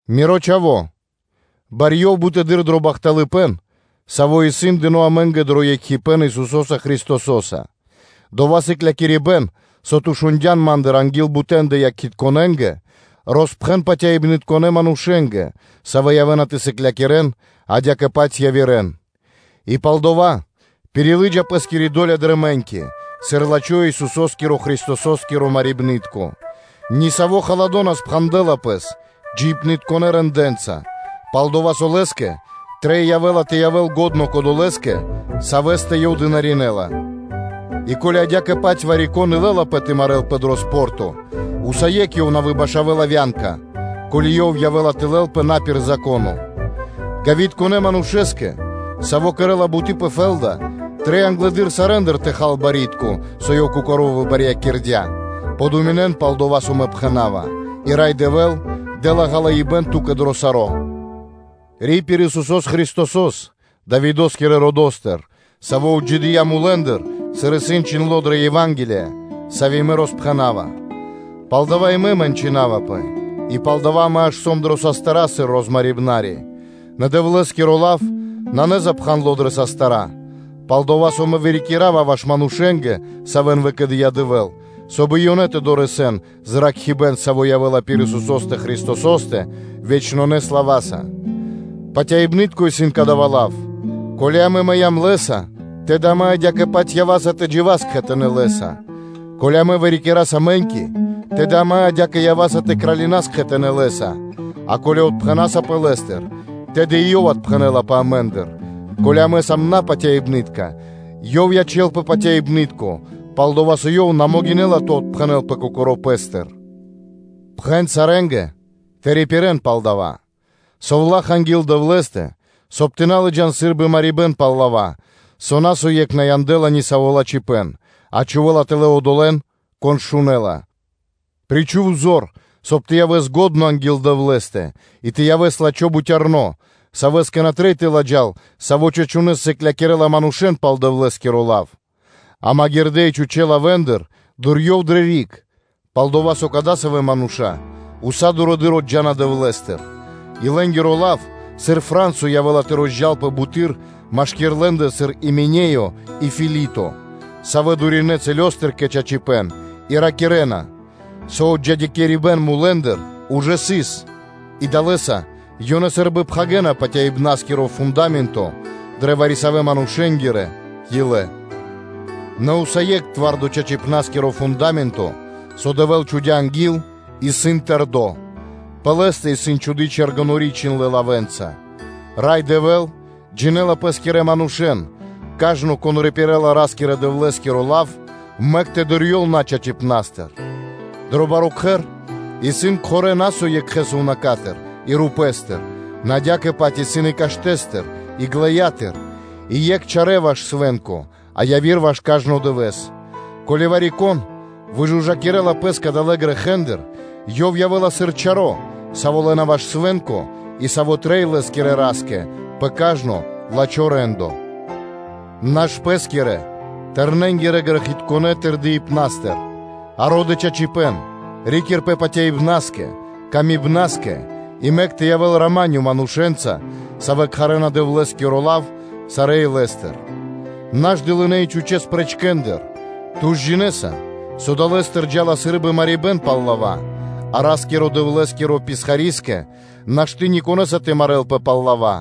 Ми́ро чха́во, барьёв бутэды́р дро бахталыпэ́н, саво́ исын дыно́ амэ́нгэ дро екхипэ́н Исусо́са Христосо́са, дова́ сыклякирибэ́н, со ту шундя́н ма́ндыр анги́л бутэндэ якхитконэнгэ, роспхэн патяибнытконэ манушэ́нгэ, савэ́ явэ́на тэ сыклякирэ́н адя́кэ-паць явирэ́н. И палдава́ пирилыджа пэ́скири до́ля дрэ мэ́ньки, сыр лачхо́ Исусо́скиро Христосо́скиро халадо. Нисаво́ халадо на спхандэла пэс джиибнытконэ рэндэ́нца, пал-дова́ со лэ́скэ трэй явэ́ла тэ явэ́л лачхо́ кодолэ́скэ, савэ́стэ ёв дынаринэла. И ко́ли адя́кэ-паць вари-кон и лэ́лапэ тэ марэ́лпэ дрэ атлетика, усае́кх ёв на выбашавэла (на выкхэлэла) вя́нка, ко́ли ёв явэ́ла тэ кэрэ́л на пир упхэныбэ́н. Гавитконэ манушэ́скэ, саво́ кэрэ́ла буты́ пэ фэ́лда, трэй англэды́р сарэ́ндыр тэ хал барьякирдо́ (пло́до), со ёв кокоро́ выбарьякирдя. Дэ годы пэскэ (подумин) пал дова́, со мэ пхэна́ва, и Рай Дэвэ́л дэ́ла ґалыибэ́н ту́кэ дро саро́. Ри́пир Исусо́с Христосо́с, Давидо́скирэ родо́стыр, Саво́ отджидыя́ мулэ́ндыр, сыр исын чхиндло́ дрэ Ева́нгелия, сави́ мэ роспхэнава, пал дава́ мэ и мэнчынавапэ, и пал дава́ мэ аж сом дрэ састыра́ сыр розмарибнари: нэ Дэвлэ́скиро лав исын на запхандло дрэ састыра́. Палдава́ мэ саро́ вырикирава ваш манушэ́нгэ, савэ́н выкэдыя́ Дэвэ́л, соб (кай) и ёнэ тэ дорэсэн зракхибэ́н, саво́ явэ́ла пир Исусо́стэ Христосо́стэ вечнонэ слава́са. Патяибны́тко исын кадава́ лав: “Ко́ли амэ мыям Лэ́са, тэды амэ адя́кэ-паць ява́са и тэ джива́с кхэтанэ́ Лэ́са; ко́ли амэ вырикираса мэ́ньки, тэды амэ адя́кэ ява́са тэ кралинас кхэтанэ́ Лэ́са, а ко́ли отпхэнасапэ Лэ́стыр, тэды и Ёв отпхэнэлапэ амэ́ндыр; ко́ли амэ на сам патяибнытка, Ёв ячэ́лпэ патяибны́тко, пал-дова́ со Ёв на могинэ́ла тэ отпхэнэлпэ Кокоро́ Пэ́стыр.” Пхэн сарэ́нгэ тэ рипирэ́н пал дава́; совлаха́ анги́л Дэвлэ́стэ, соб (кай) тэ на лыджа́н сы́рбы марибэ́н пал лава́, со на со екх на яндэла нисаво́ лачхипэ́н, а чхувэ́ла тэлэ́ одолэ́н, кон шунэ́ла. Причху́в зор, соб (кай) ту тэ явэс лачхо́ анги́л Дэвлэ́стэ, и тэ явэс лачхо́ бутярно, савэ́скэ на трэй тэ ладжал, саво́ чачунэ́с сыклякирэ́ла манушэ́н пал Дэвлэ́скиро лав. А дылынэ́ и чхучэ́ лавэ́ндыр джа́ криг, пал-дова́ со кадасавэ́ мануша́ уса́ дурэды́р отджана Дэвлэ́стыр, и лэ́нгиро лав, сыр кирмо (рако), явэ́ла тэ розджалпэ бутэды́р, машки́р лэ́ндэ исын Именеё, и Филито; савэ́ дуринэ цэлёстыр (рэса́тыр) кэ чачипэ́н и ракирэ́на, со отджидякирибэн мулэ́ндыр ужэ сыс, и далэ́са ёнэ сы́рбы пхагирэна патяибнаскиро фунда́менто дрэ вари-савэ́ манушэ́нгирэ илэ. Нэ усае́кх зорало́ чачыпнаскиро фунда́менто, со Дэвэ́л чхудя́ анги́л, исын тэрдо́, пэ лэ́стэ исын чхуды́ чэргэнори́ чхиндлэ́ лавэ́нца: “Рай Дэвэ́л джинэ́ла Пэскирэн манушэ́н, кажно, кон рипирэла Ра́скирэ-Дэвлэ́скиро лав, мэк тэ дурьёл начачипнастыр.” Дрэ баро́ кхэр исын кхорэ́ на со екхэ сувнака́стыр и рупэ́стыр, нэ адя́кэ-паць исын и каштэ́стыр и ґлэятыр (глинатыр); и екх чарэ́ ваш свэ́нко, а яви́р ваш кажно дывэ́с, ко́ли вари-кон выжужакирэ́ла пэс кадалэ́ грэхэ́ндыр, ёв явэ́ла сыр чаро́, саво́ лэ́на ваш свэ́нко и саво́ трэй лэ́скирэ Ра́скэ пэ кажно лачхо́ рэ́ндо. Наш пэ́скирэ – тэрнэнгирэ грэхитконэ́ тырдыпнастыр, а ро́дэ чачипэ́н, ри́кирпэ патяибнаскэ, патыва́кэ кэ яви́р мануша́ и мэк тэ явэ́л рамане манушэ́нца, савэ́ кхарэ́на Дэвлэ́скиро лав сарэ́ илэ́стыр. Наш дылынэ́ и чхучэ́ спрэчкэндыр, ту ж джинэ́са, со далэ́стыр джа́ла чинга́рд. А Ра́скирэ-Дэвлэ́скиро писхари́скэ нашты́ никонэса тэ марэ́лпэ пал лава́,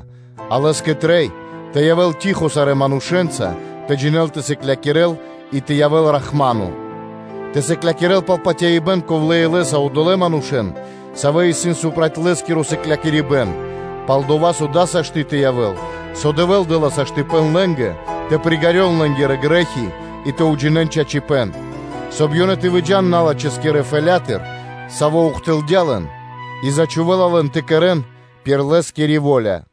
а лэ́скэ трэй тэ явэ́л штыл (тихо) сарэ́ манушэ́нца, тэ джинэ́л тэ сыклякирэ́л и тэ явэ́л рахмано (бихолынакиро); тэ сыклякирэ́л пал патяибэ́н ковлэ́ илэ́са одолэ́ манушэ́н, савэ́ исын проти лэ́скиро сыклякирибэ́н, пал-дова́ со дава́ сашты́ тэ явэ́л, со Дэвэ́л дэ́ла саштыпэн (возможность/ваканцыя) лэ́нгэ тэ приґалён лэ́нгирэ грэ́хи и тэ уджинэ́н чачипэ́н, соб (кай) ёнэ тэ выджа́н налачхэскирэ фэлятыр, саво́ ухтылдя лэн, и зачхувэла лэн тэ кэрэ́н пир лэ́скири во́ля.